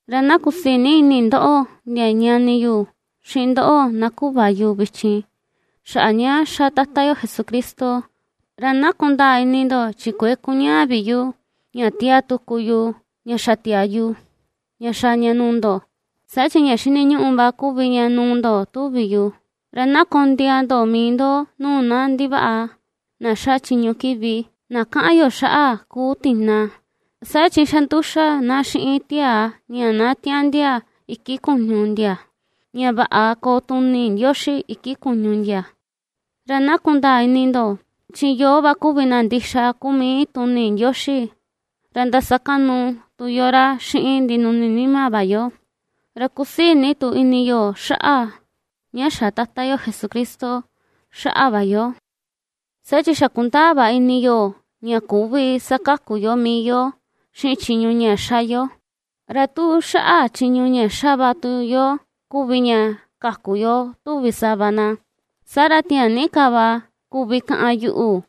Ra na kusii ni ini ndoꞌo ndia ñani yu, xiꞌin ndoꞌo na kuꞌva yu vichin, xaꞌa ña ^xa Tata yo Jesucristo. Ra na kundaa ini ndo chi kuëe kuñaa vi yu ña ^tiaa tuku yu ña xa tiaa yu, ña xaa ña nuu ndo, saa chi ña xiniñuꞌu va kuvi ña nuu ndo tuvi yu. Ra na kondiaa ndo mii ndo nuu na ndivaꞌa na ^xa chiñu kiꞌvi, na kaꞌan yo xaꞌa kuu “tina”, saa chi xa nduxa na xiꞌin tiaa ña na tiaꞌndia iki kuñu ndia, ña vaꞌa koo tuni Ndioxi iki kuñu ndia. Ra na kundaa ini ndo, chi yoo va kuvi na ndixa kuu mii tuni Ndioxi, ra ndasakaꞌnu tu yo ra xiꞌin ndinuni nima va yo, ra kusii ni tu ini yo xaꞌa ña xa̱ Tata yo Jesucristo xaꞌa va yo, saa chi xa kundaa va ini yo ña küvi sakaku yo mii yo xiꞌin chiñu ña ^xa yo. Ra tu xaꞌa chiñu ña xa va tu yo kuvi ña kaku yo tuvi sava na, saa ra tiaa ni ka va kuvi kaꞌan yuꞌu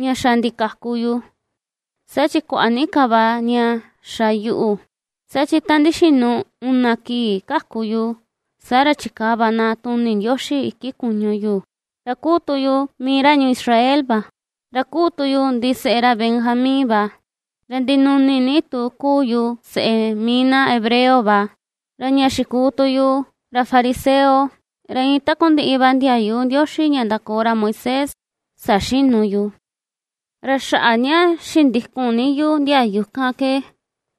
ña xa ndikaku yu, saa chi kuaꞌa ni ka va ña xa yuꞌu. Saa chi ta ndixinu una kii kaku yu, saa ra chikaa va na tuni Ndioxi iki kuñu yu, ra kuu tu yu mii ra ñuu Israel va; ra kuu tu yu ndiseꞌe ra Benjamín va; ra ndinuni ni tu kuu yu seꞌe mii na hebreo va. Ra ña xikuu tu yu ra fariseo, ra iin takundiꞌi va ndiayu Ndioxi ña ndakoo ra Moisés saxinu yu. Ra xaꞌa ña xindikun ni yu ndiayu kan ke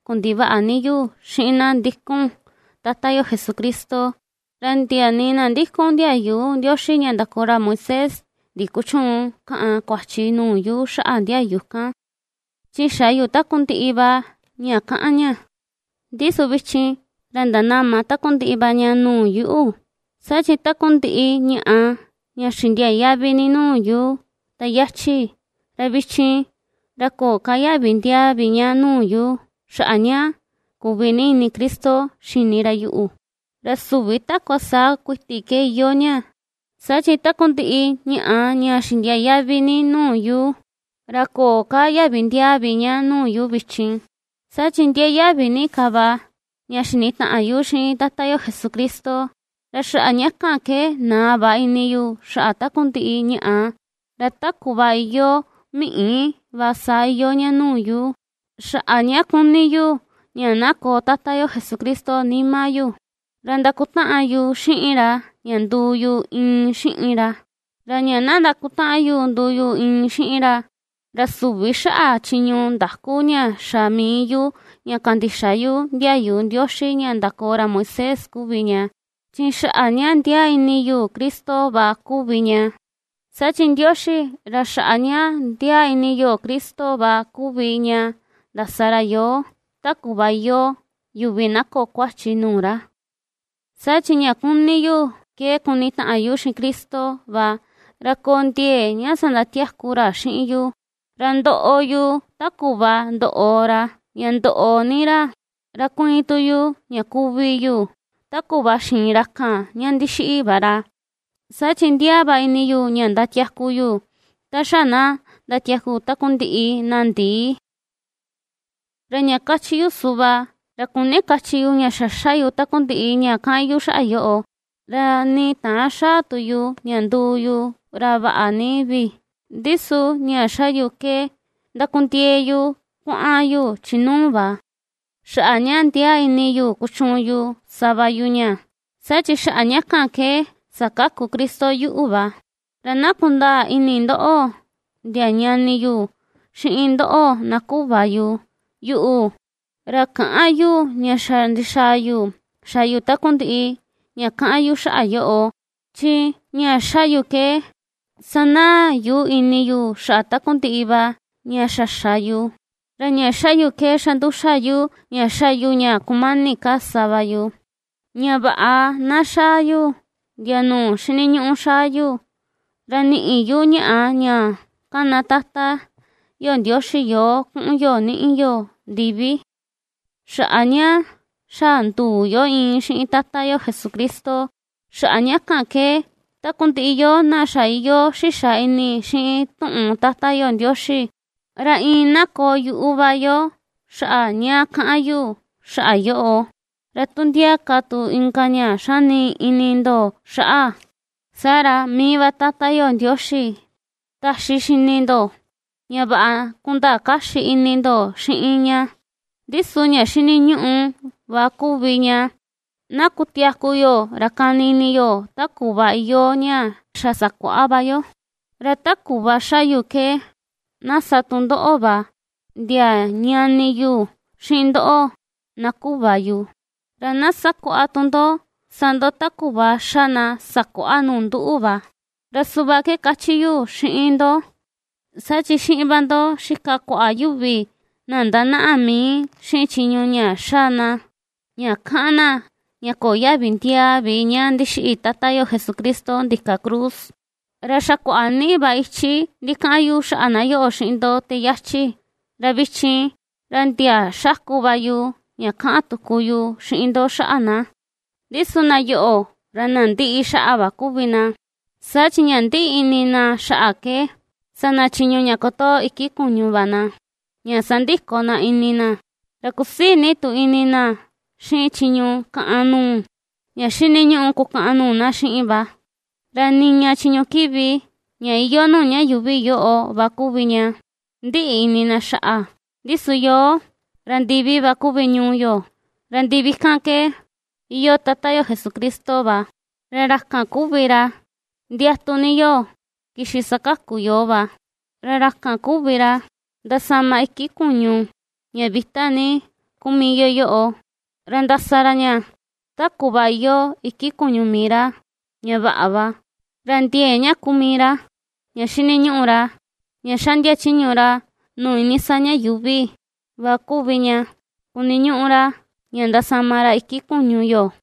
kundivaꞌa ni yu xiꞌin na ndikun Tata yo Jesucristo, ra ndia nii na ndikun ndiayu Ndioxi ña ndakoo ra Moisés ndikuchüun kaꞌan kuachi nuu yu xaꞌa ndiayu kan, chi xa yu takundiꞌi va ña kaꞌan ña. Ndi su vichin, ra ndanama takundiꞌi va ña nuu yuꞌu, saa chi takundiꞌi ñaꞌa ña xindiaa yaꞌvi ni nuu yu ta yachi, ra vichin, ra köo ka yaꞌvi ndiaa vi ña nuu yu, xaꞌa ña kuꞌvi ini Cristo xini ra yuꞌu. Ra süvi takua saa kuiti ke iyoo ña, saa chi takundiꞌi ñaꞌa ña xindiaa yaꞌvi ni nuu yu, ra köo ka yaꞌvi ndiaa vi ña nuu yu vichin, saa chi ndiaa yaꞌvi ni ka va ña xinitaꞌan yu xiꞌin Tata yo Jesucristo. Ra xaꞌa ña kan ke naa va ini yu xaꞌa takundiꞌi ñaꞌa, ra ta kuꞌva iyoo miꞌi va saa iyoo ña nuu yu, xaꞌa ña kuni yu ña na koo Tata yo Jesucristo nima yu, ra ndakutaꞌan yu xiꞌin ra ña nduu yu iin xiꞌin ra. Ra ña ndakutaꞌan yu nduu yu iin xiꞌin ra, ra süvi xaꞌa chiñu ndaku ña xa mii yu ña kandixa ndiayu Ndioxi ña ndakoo ra Moisés kuvi ña, chi xaꞌa ña ndiaa ini yu Cristo kuvi ña. Saa chi Ndioxi ra xaꞌa ña ndiaa ini yo Cristo va kuvi ña ndasa ra yoo, ta kuꞌva iyoo yuvi na köo kuachi nuu ra. Saa chi ña kuni yu ke kunitaꞌan yu xiꞌin Cristo va, ra koo ndiee ña sandatiaku ra xiꞌin yu, ra ndoꞌo yu ta kuꞌva ndoꞌo ra, ña ndoꞌo ni ra, ra kuiin tu yu ña kuvi yu, ta kuꞌva xiin ra kan ña ndixiꞌi va ra, saa chi ndiaa va ini yu ña ndatiaku yu, ta xa na ndatiaku takundiꞌi na ndii. Ra ña kachi yu suꞌva, ra küni kachi yu ña xa ^xa yu takundiꞌi ña kaꞌan yu xaꞌa yoꞌo, ra nii täan xaa tu yu ña nduu yu ra vaꞌa ni vi; ndi su ña ^xa yu ke ndakundiee yu kuaꞌan yu chi nuu va, xaꞌa ña ndiaa ini yu kuchuun yu sa va yu ña, saa chi xaꞌa ña kan ke sakaku Cristo yuꞌu va. Ra na kundaa ini ndoꞌo ndia ñani yu, xiꞌin ndoꞌo na kuꞌva yu, yuꞌu, ra käꞌan yu ña xa ndixaa yu xa yu takundiꞌi ña kaꞌan yu xaꞌa yoꞌo; chi ña ^xa yu ke, ^sanaa yu ini yu xaꞌa takundiꞌi va ña xa xa yu, ra ña ^xa yu ke xa nduxa yu ña ^xa yu ña kumani ka sa va yu, ña vaꞌa na xaa yu ndia nuu xiniñuꞌu xaa yu, ra niꞌi yu ñaꞌa ña ^kana Tata yo Ndioxi yoo kuꞌun yo niꞌi yo ndivi, xaꞌa ña xa nduu yo iin xiꞌin Tata yo Jesucristo. Xaꞌa ña kan ke, takundiꞌi yoo na xa iyoo xixa ini xiꞌin tuꞌun Tata yo Ndioxi, ra iin na koo yuꞌu va yo xaꞌa ña kaꞌan yu xaꞌa yoꞌo. Ra tu ndia ka tu inka ña xani ini ndo xaꞌa, saa ra mii va Tata yo Ndioxi, taxi xini ndo, ña vaꞌa kundaa kaxi ini ndo xiꞌin ña. Ndi su ña xiniñuꞌu va kuvi ña, na kutiaku yo ra kani ini yo ta kuꞌva iyoo ña xa sakuaꞌa va yo. Ra ta kuꞌva ^xa yuꞌu ke, na sa tu ndoꞌo va, ndia ñani yu, xiꞌin ndoꞌo, na kuꞌva yu; ra na sakuaꞌa tu ndo sa ndo ta kuꞌva ^xa na sakuaꞌa nuu nduꞌu va. Ra suꞌva ke kachi yu xiꞌin ndo, saa chi xiꞌin va ndo xika kuaꞌa yuvi na ndañaꞌa mii xiꞌin chiñu ña xa na, ña kaꞌan na ña köo yaꞌvi ndiaa vi ña ndixiꞌi Tata yo Jesucristo ndika cruz, ra xa kuaꞌa ni va ichi ndikaꞌan yu xaꞌa na yoꞌo xiꞌin ndo te yachi, ra vichin, ra ndia xaku va yu ña kaꞌan tuku yu xiꞌin ndo xaꞌa na. Ndi su na yoꞌo, ra na ndiꞌi xaꞌa va kuvi na. Saa chi ña ndiꞌi ini xaꞌa ke sa na chiñu ña kotoo iki kuñu va na ña sandiko na ini na, ra kusii ni tu ini na xiꞌin chiñu kaꞌan nuu, ña xiniñuꞌu kukaꞌan nuu na xiꞌin va. Ra niña chiñu kiꞌvi ña iyoo nuu ña yuuvi yoꞌo va kuvi ña ndiꞌi ini na xaꞌa. Ndi su yoo, ra ndivi va kuvi ñuu yo, ra ndivi kan ke iyoo Tata yo Jesucristo va; ra ra kan kuvi ra ndiatu ni yo kixi sakaku yoo va. Ra ra kan kuvi ra, ndasama iki kuñu ña vita ni kuu mii yo yoꞌo, ra ndasa ra ña ta kuꞌva iyoo iki kuñu mii ra, ña vaꞌa va. Ra ndiee ña kuu mii ra, ña xiniñuꞌu ra ña ^xaꞌndia chiñu ra nuu iinii saa ña yuuvi va kuvi ña kuniñuꞌu ra ña ndasama ra iki kuñu yo.